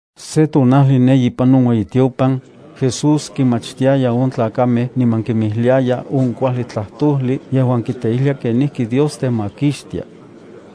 Sen tonajli ne ipan on ueyitiopan, Jesús kinmachtiaya on tlakamej niman kinmijliaya on kuajli tlajtojli yejuan kiteijlia ken Dios temakixtia.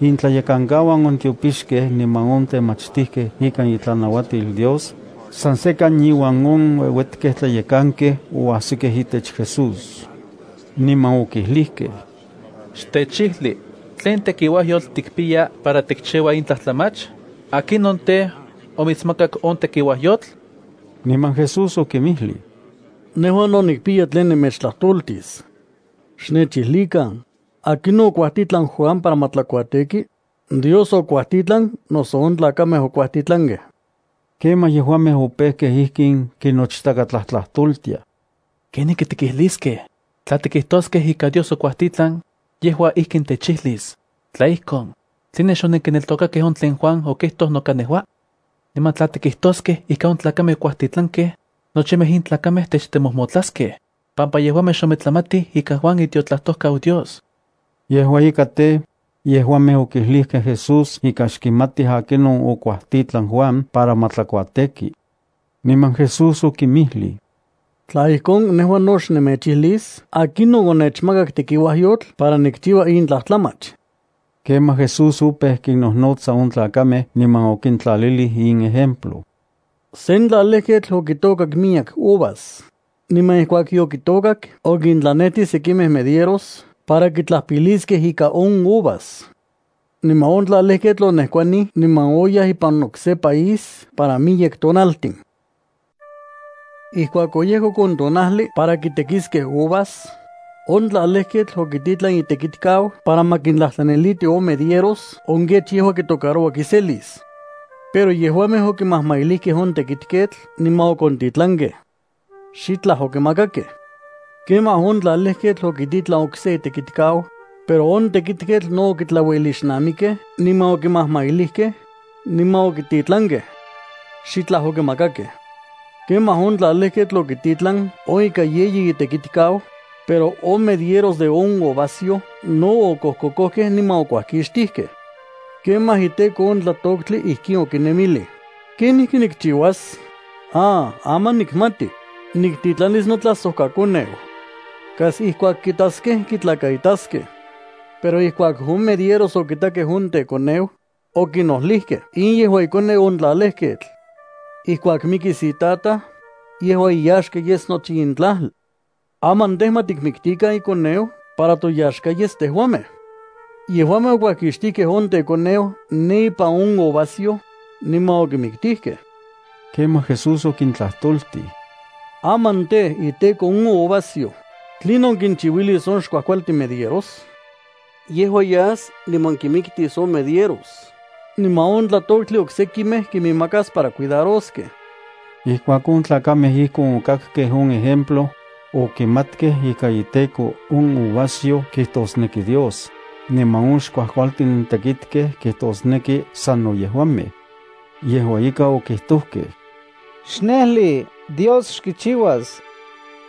Intlayekankauan on tiopixkej niman on temachtijkej ikan itlanauatil Dios, san sekan iuan on ueuetkej tlayekankej oajsikej itech Jesús, niman okijlijkej: —Xtechijli, ¿tlen tekiuajyotl tikpiya para tikchiua in tlajtlamach? ¿Akinon tej, omitsmakak on tekiuajyotl? Niman Jesús okinmijlij: —Nejua no nikpiya tlen nemechtlajtoltis. Xnechijlikan, ¿akinon okuajtitlan Juan para ma tlakuateki? ¿Dios okuajtitlan, noso on tlakamej okuajtitlankej? Kemaj yejuamej opejkej ijkin kinochtakatlajtlajtoltiaj: —¿Kenijki tikijliskej? Tla tikijtoskej ika Dios okuajtitlan, yejua ijkin techijlis: “Tla ijkon, ¿tline xonenkineltokakej on tlen Juan okijtoj noka nejua?” Niman tla tikijtoskej ika on tlakamej okuajtitlankej, nochimej in tlakamej techtemojmotlaskej, pampa yejuamej xometlamatij ika Juan itiotlajtojkau Dios. Yejua ika tej, yejuamej okijlijkej Jesús ika xkimatij akinon okuajtitlan Juan para ma tlakuateki. Niman Jesús okinmijlij: —Tla ijkon, nejua no xnemechijlis akinon onechmakak tekiuajyotl para nikchiua in tlajtlamach. Kemaj Jesús opeu kinnojnotsa on tlakamej niman okintlalilij in ejemplo: —Sen tlalejketl okitôkak miyek uvas, niman ijkuak yokitôkak okintlanejtij sekimej medieros para kitlajpiliskej ikan on uvas. Niman on tlalejketl onejkuanij niman oyaj ipan okse país para miyek tonaltin. Ijkuak oyejkok on tonajli para kitekiskej uvas, on tlalejketl okititlan itekitkau para ma kintlajtlaniliti on medieros on kech yejua kitocaroua kiselis. Pero yejuamej okimajmailijkej on tekitketl niman okontitlankej. Xitlaj okimakakej. Kemaj on tlalejketl okititlan okse itekitkau, pero on tekitketl no okitlauelixnamikej niman okimajmailijkej, niman okititlankej. Xitlaj okimakakej. Kemaj on tlalejketl okititlan on ika yeyi itekitkau, pero on medieros de on uvasyoj no okojkokojkej niman okuajkixtijkej. ’Kemaj iteko on tlatoktli ijkin okinemilij: “¿Kenijki nikchiuas? ¡Ah, aman nikmati! Niktitlanis notlajsojkakoneu. Kas ijkuak kitaskej kitlakaitaskej.” Pero ijkuak on medieros okitakej on tekoneu, okinojlijkej: “In yejua ikoneu on tlalejketl. Ijkuak mikis itataj, yejua iyaxka yes nochi in tlajli. Aman tej, ma tikmiktikan ikoneu para toyaxka yes tejuamej.” Yejuamej okuajkixtijkej on tekoneu ne ipan on uvasyoj, niman okimiktijkej. Kemaj Jesús okintlajtoltij: —Aman tej, iteko on uvasyo, ¿tlinon kinchiuilis on xkuajkualtin medieros? Yejua yas niman kinmiktis on medieros niman on tlatoktli oksekimej kinmakas para cuidaroskej. Ijkuak on tlakamej ijkon okakkej on ejemplo, okimatkej ika iteko on uvasyo kijtosneki Dios, niman on xkuajkualtin tekitkej kijtosneki sano yejuamej. Yejua ika okijtojkej: —¡Xnejli! Dios xkichiuas.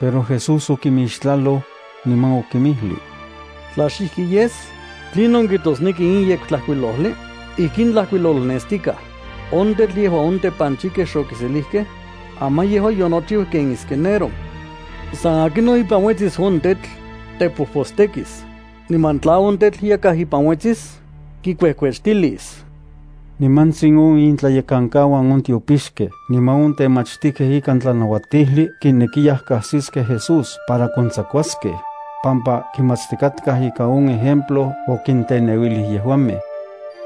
Pero Jesús okimixtlaloj, niman okinmijlij: —Tla xijki yes, ¿tlinon kijtosneki in Yektlajkuilojli? Ijkin tlajkuilolnestikaj: On tetl yejuan on tepanchijkej xokiselijkej, aman yejua yonochiu ken esquinero. San akinon uetsis ipan on tetl, tepojpostekis, niman tla on tetl yakaj ipan uetsis, kikuejkuechtilis. Nimantsin on intlayekankauan on tiopixkej niman on temachtijkej ikan tlanauatijli kinekiyaj kajsiskej Jesús para kontsakuaskej, pampa kimatstikatkaj ika on ejemplo okinteneuilij yejuamej.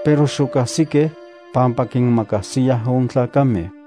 Pero xokajsikej, pampa kinmakajsiyaj on tlakamej.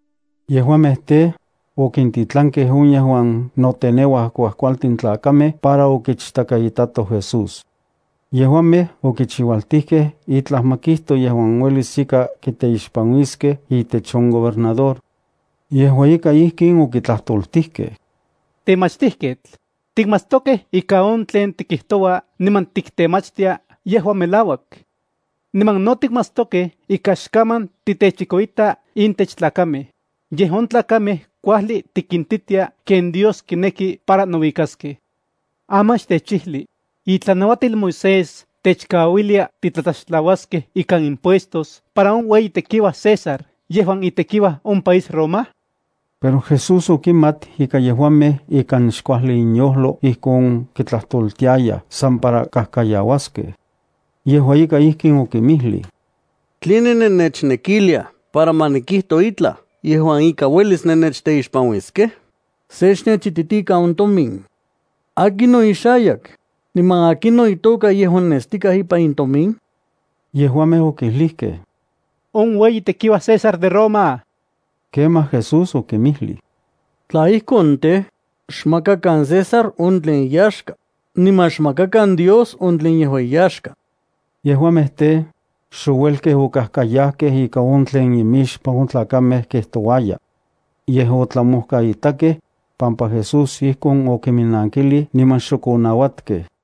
Yejuamej tej, okintitlankej on yejuan noteneuaj kuajkualtin tlakamej para okichtakaitatoj Jesús. Yejuamej okichiualtijkej itlaj ma kijto yejuan uelis ika kitemaktiliskej itech on gobernador. Yejua ika ijkin okitlajtoltijkej: —Temachtijketl, tikmatstokej ika on tlen tikijtoua niman tiktemachtia yejua tlen melauak. Niman no tikmatstokej ika xkaman titechikoita intech tlakamej, yej on tlakamej kuajli tikintitia ken Dios kineki para nouikaskej. Aman xtechijli: ¿Itlanauatil Moisés techkauilia titlatlaxtlauaskej ikan impuestos para on ueyi tekiuaj César yejuan itekiuaj on país Roma? Pero Jesús okimat ika yejuamej ikan xkuajli inyojlo ijkon kitlajtoltiayaj san para kajkayauaskej. Yejua ika, ijkin okinmijlij: —¿Tline nennechnekiliaj para ma nikijto itlaj yejuan ika uelis nennechteixpanuiskej? Se xnechititikan on tomin. ¿Akinon ixayak, niman akinon itoka yejuan nestikaj ipan in tomin? Yejuamej okijlijkej: —On ueyi tekiuaj César de Roma. Kemaj Jesús okinmijlij: —Tla ijkon tej, xmakakan César on tlen iyaxka, niman xmakakan Dios on tlen yejua iyaxka. Yejuamej tej, xouelkej okajkayajkej ika on tlen imixpan on tlakamej kijtouaya. Yej, otlamojkaitakej, pampa Jesús ijkon okiminnankilij niman xok onauatkej.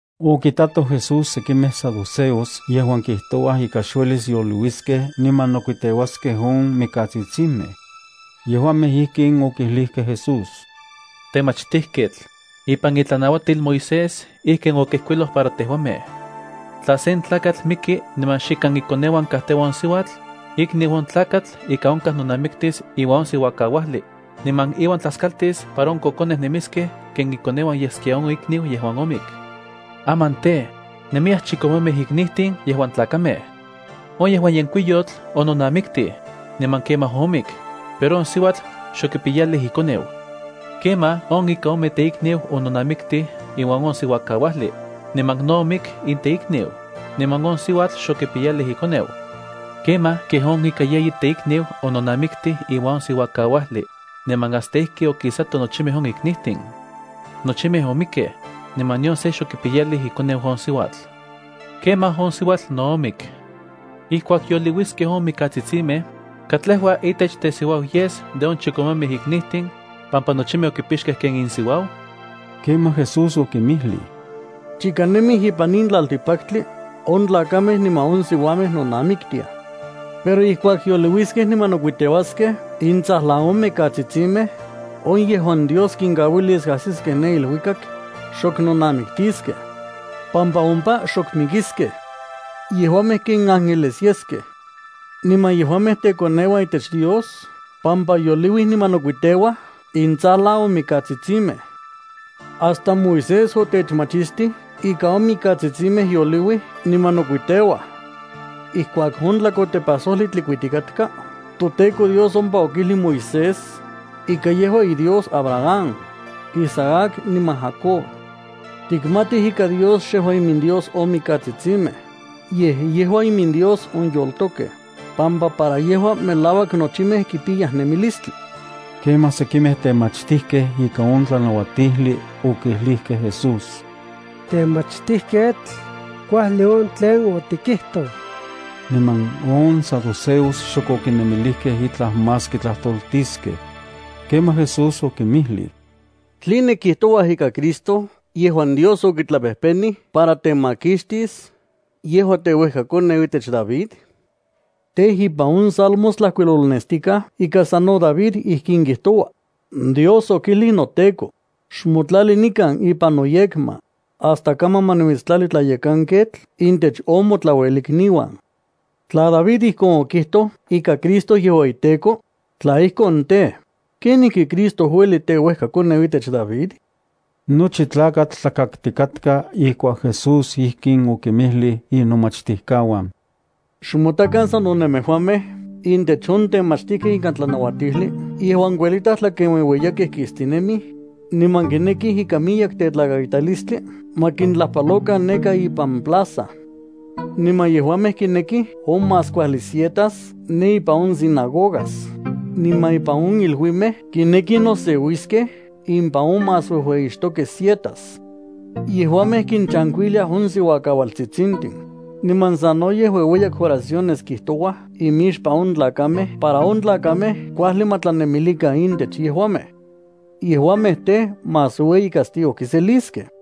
Okitatoj Jesús sekimej saduceos yejuan kijtouaj ika xuelis yoliuiskej niman nokuiteuaskej on mikatsitsimej. Yejuamej ijkin okijlijkej Jesús: —Temachtijketl, ipan itlanauatil Moisés ijkin okijkuiloj para tejuamej. Tla sen tlakatl miki niman xikan ikoneuan kajteua on siuatl, ikniu on tlakatl ika onkaj nonamiktis iuan on siuakauajli, niman iuan tlaskaltis para on kokonej nemiskej ken ikoneuan yeskia on ikniu yejuan omik. Aman tej, nemiyaj chikomemej iknijtin yejuan tlakamej. On yejuan yenkuiyotl ononamiktij, niman kemaj omik, pero on siuatl xokipiyalij ikoneu. Kemaj on ika ome teikniu ononamiktij iuan on siuakauajli, niman no omik in teikniu, niman on siuatl xokipiyalij ikoneu. Kemaj kej on ika yeyi teikniu ononamiktij iuan on siuakauajli, niman hasta ijki okisatoj nochimej on iknijtin. Nochimej omikkej, niman nion se xokipiyalij ikoneu on siuatl. Kemaj on siuatl no omik. Ijkuak yoliuiskej on mikatsitsimej, ¿katlejua itech tesiuau yes de on chikomemej iknijtin, pampa nochimej okipixkej ken insiuau? Kemaj Jesús okinmijlij: —Chika nemij ipan in tlaltikpaktli, on tlakamej niman on siuamej nonamiktiaj. Pero ijkuak yoliuiskej niman nokuiteuaskej intsajlan on mikatsitsimej, on yejuan Dios kinkauilis ajsiskej ne iluikak, xok nonamiktiskej, pampa ompa xok mikiskej. Yejuamej ken ángeles yeskej. Niman yejuamej tekoneuan itech Dios pampa yoliuij niman nokuiteuaj intsajlan on mikatsitsimej. Hasta Moisés otechmachistij ika on mikatsitsimej yoliuij niman nokuiteuaj. Ijkuak on tlakotepajsojli tlikuitikatka, toTEKO Dios ompa okijlij Moisés ika yejua iDios Abraham, Isaac niman Jacob. Tikmatij ika Dios xejua iminDios on mikatsitsimej, yej yejua iminDios on yoltokej, pampa para yejua melauak nochimej kipiyaj nemilistli. Kemaj sekimej temachtijkej ikan on tlanauatijli okijlijkej Jesús: —Temachtijketl, kuajli on tlen otikijtoj. Niman on saduceos xok okinemilijkej itlaj más kitlajtoltiskej. Kemaj Jesús okinmijlij: —¿Tline kijtouaj ika Cristo yejuan Dios okitlapejpenij para temakixtis yejua teuejkakoneu itech David? Tej, ipan on Salmos tlajkuilolnestikaj ika sano David ijkin kijtoua: Dios okijlij noTEKO: “Xmotlali nikan ipan noyekma, hasta kaman ma nimitstlali tlayekanketl intech on motlauelikniuan.” Tla David ijkon okijtoj ika Cristo yejua iTEKO, tla ijkon tej, ¿kenijki Cristo ueli teuejkakoneu itech David? Nochi tlakatl tlakaktikatka ijkuak Jesús ijkin okinmijlij inomachtijkauan: —Xmotakan sano nemejuamej intech on temachtijkej ikan tlanauatijli yejuan kuelitaj tlakenueueyakej kistinemij, niman kinekij ikan miyek tetlakaitalistli ma kintlajpalokan neka ipan plaza. Niman yejuamej kinekij on más kuajli sietas ne ipan on sinagogas, niman ipan on iluimej kinekij noseuiskej ipan on más uejueyixtokej sietas. Yejuamej kinchankuiliaj on siuakaualtsitsimej, niman sanoyej ueueyak oraciones kijtouaj imixpan on tlakamej para on tlakamej kuajli ma tlanemilikan intech yejuamej. Yejuamej tej, más ueyi castigo kiseliskej.